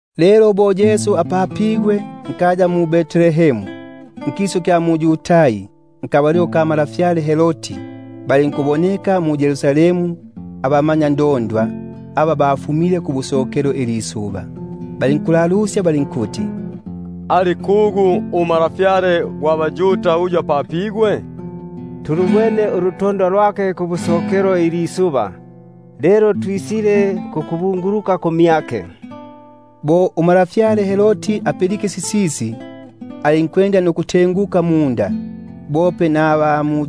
Lelo bo apapigwe Yesu mu-Betlehemu nkisu kya mu-Yudai, mmasiku ga ntwa Herodi, popapo balinkuboneka mu-Yerusalemu abamanyandondwa aba bafumile kubusokelo ilisuba, balinkuti: Ali kugu untwa gwa baYuda umpapigwa lilino? Namanga tulubwene ulutondwa lwake kubusokelo ilisuba, twisile kukubunguluka kumyake. Umwene untwa Herodi bo apilike sisisi, silinkunnyomosya, bope naba mu-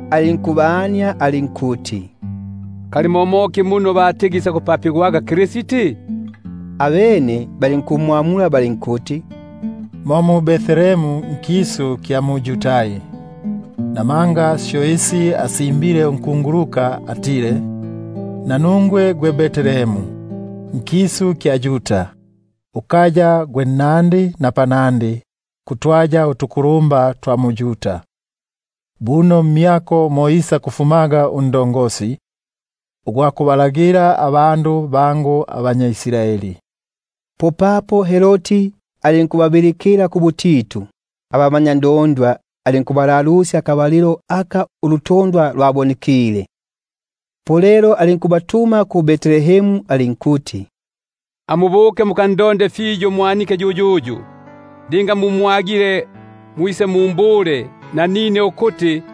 alinkubalalusya muno isakupapigwaga Kristi. Abene balinkumbula balinkuti: Mu-Betlehemu nkisu kya mu-Yudai; buno lyo lyasimbigwe nunkunguluka ukuti: Nungwe gwe Betlehemu gwe uli nkisu kya Yuda, Ungatigi uli nnandi mbalagili ba mwa Yuda; Kabuno mmyako isakufumamo undagili, Uyu isakubatimaga abandu bangu abanya Israeli. Popapo Herodi alinkubabilikila kubutitu abamanyandondwa, alinkubania akabalilo aka lwabonekile ulutondwa. Alinkubatuma ku-Betlehemu alinkuti: Amubukege mukalalusyege fiyo isya mwanike; linga mumwagile, mwise mumbule, ukuti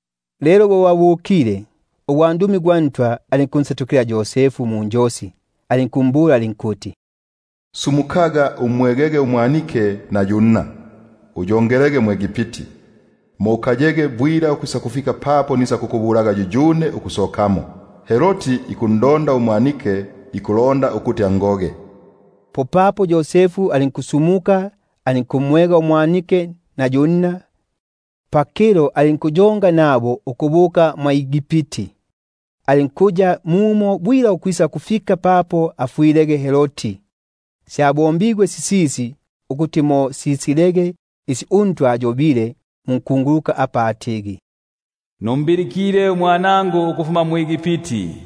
Lelo bo babukile, po ugwandumi gwa Ntwa alinkunsetukila Yosefu munjosi alinkuti: Sumukaga, umwegege umwanike nunna, uyongelege mwʼEgipti, ukayege mumo ukwisakufika papo nisakukubulaga; namanga Herodi ikuya pakundonda umwanike ukuti angoge. Popapo alinkusumuka alinkumwega umwanike na yu nna pakilo, alinkubuka mwʼEgipti. Alinkuya mumo bwila ukwisakufika papo afwilege Herodi; ukuti mo simalikilege sisyo uNtwa asiyobile munkunguluka apa atigi: Nalimbilikile umwanangu ukufuma mwʼEgipti.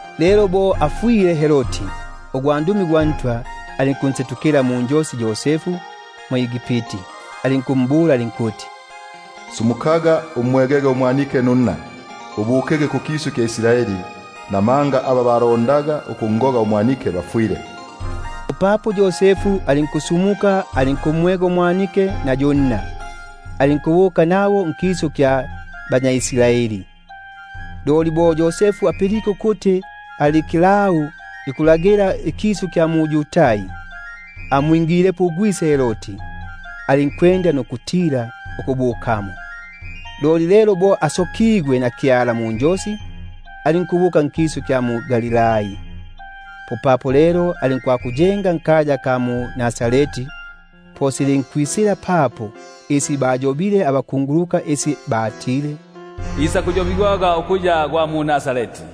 Lelo bo afwile Herodi, popapo ugwandumi gwa Ntwa alinkunsetukila munjosi Yosefu mwʼEgipti alinkuti: Sumukaga umwegege umwanike nunna, ubukege nkisu kya Israeli, namanga bafwile aba babulondaga ubumi bwa mwanike. Umwene alinkusumuka, alinkumwega umwanike nunna, alinkubuka nkisu kya Israeli. Loli bo apilike ukuti Arikilau ikukilagila ikisu kya Yudai mbuyo bwa gwise Herodi, alinkutila ukubukamo; loli bo asokigwe munjosi, alinkubuka nkisu kya mu-Galilai. Alinkubuka alinkwakuyenga nkaya aka batigi Nazareti; ukuti sisege sisyo syayobigwaga nabakunguluka ukuti: Isakuyobigwaga ukuya nNazareti.